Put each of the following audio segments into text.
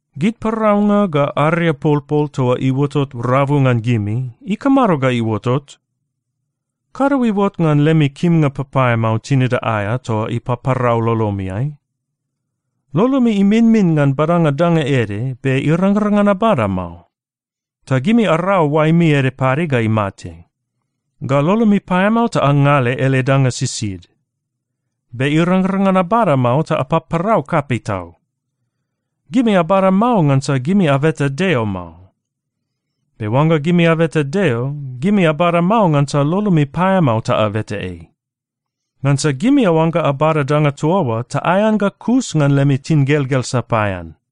Gid paraunga ga ariapolpol toa iuotot rabu ngan gimi, ikamado ga iuotot? Kado iuot ngan lemi kimnga papaeamao tinida aea toa ipaparau lolomiai? Lolomi iminmin ngan badanga danga ede, be irangrang ngan abada mao. Ta gimi arau oaemi ede pade ga imate. Ga lolomi paeamao ta angale ele danga sisid, be irangrang ngan abada mao ta apaparau kapei tau. Gimi abada mao ngansa gimi abeta Deo mao. Be oangga gimi abeta Deo, gimi abada mao ngansa lolomi paeamao ta abeta ei. Ngansa gimi aoangga abada danga toa oa ta aean ga kus ngan lemi tingelgel sapaean.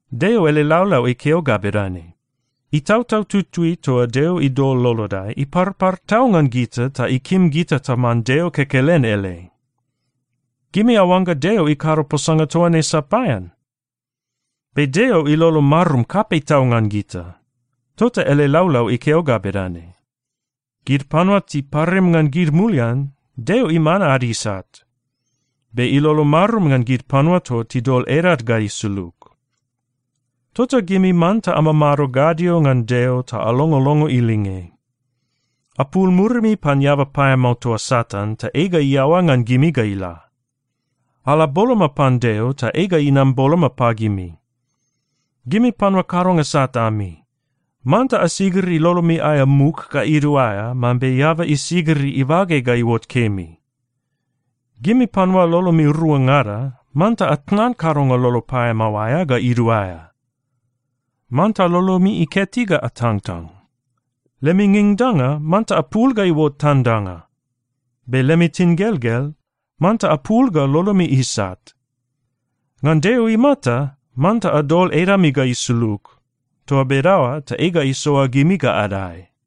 Deo ele laulau ikeo ga bedane, “Itautau Tutui toa Deo idol lolodai, iparpar tau ngan gita ta ikim gita taman Deo kekelen ele.” Gimi aoangga Deo ikado posanga toa ne sapaean? Be Deo ilolo marum kapei tau ngan gita. Tota ele laulau ikeo ga bedane, “Gid panua tiparim ngan gid mulian, Deo iman ad isat. Be ilolo marum ngan gid panua toa tidol edad ga isulug.” Tota gimi manta amamado gadio ngan Deo ta alongolongo ilinge. Apul murimi pan eaba paeamao toa Satan, ta ei ga iaoa ngan gimi ga ila. Ala boloma pan Deo, ta ei ga inam boloma pagimi. Gimi panua kadonga sat ami, manta asigiri lolomi aea muk ga iduaea mambe eaba isigiri ibage ga iuot kemi. Gimi panua lolomi ruangada, manta atnan kadonga lolo paeamao aea ga iduaea. Manta lolomi iketi ga atangtang. Lemi ngingdanga, manta apul ga iuot tandanga. Be lemi tingelgel, manta apul ga lolomi isat. Ngan Maron imata, manta adol edami ga isulug. Toa bedaoa ta ei ga isoa gimi ga adae.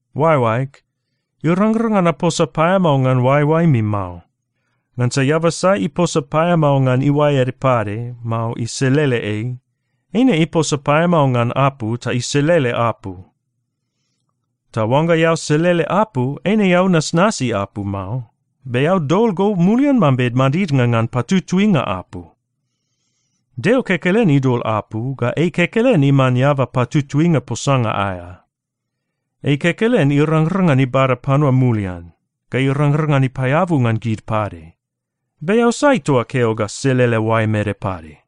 Oaeoaeg, irangrang ngan aposa paeamao ngan oaeoaemi mao. Ngansa eaba sai iposa paeamao ngan iuae ede pade, mao iselele ei, eine iposa paeamao ngan apu ta iselele apu. Ta oangga eao selele apu, eine eao nasnasi apu mao. Be eao dol go mulian mambe madidnga ngan patutuinga apu. Deo kekelen idol apu, ga ei kekelen iman eaba patutuinga posanga aea. Ei kekelen irangrang ngan ibada panua mulian, ga irangrang ngan ipaeabu ngan gid pade. Be eao sai toa keo ga selele oaem ede pade?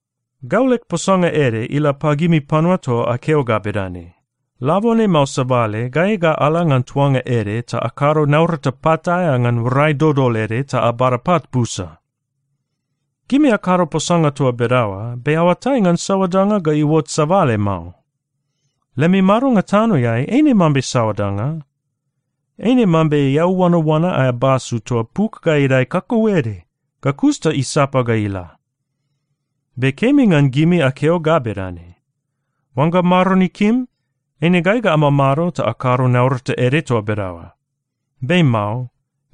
Gau leg posanga ede ila pagimi panua toa akeo ga bedane, “Labone mao sabale, gai ga ala ngan tuanga ede ta akado naurata pat aea ngan rai dodol ede ta abada pat busa.” Gimi akado posanga toa bedaoa, be aoatai ngan saoa danga ga iuot sabale mao. Lemi madonga tanoeai eine mambe saoa danga? Eine mambe eau oanaoana aea basu toa puk ga idae kautede, ga kus ta isapa ga ila. Be kemi ngan gimi akeo ga bedane, “Oangga Maron ikim, eine gai ga amamado ta akado naurata ede toa bedaoa.” Be mao.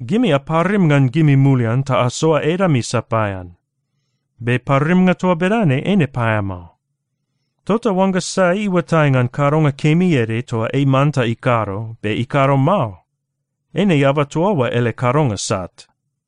Gimi aparim ngan gimi mulian ta asoa edami sapaean. Be parimnga toa bedane eine paeamao. Tota oangga sai iuatai ngan kadonga kemi ede toa ei manta ikado, be ikado mao, eine eaba toa oa ele kadonga sat.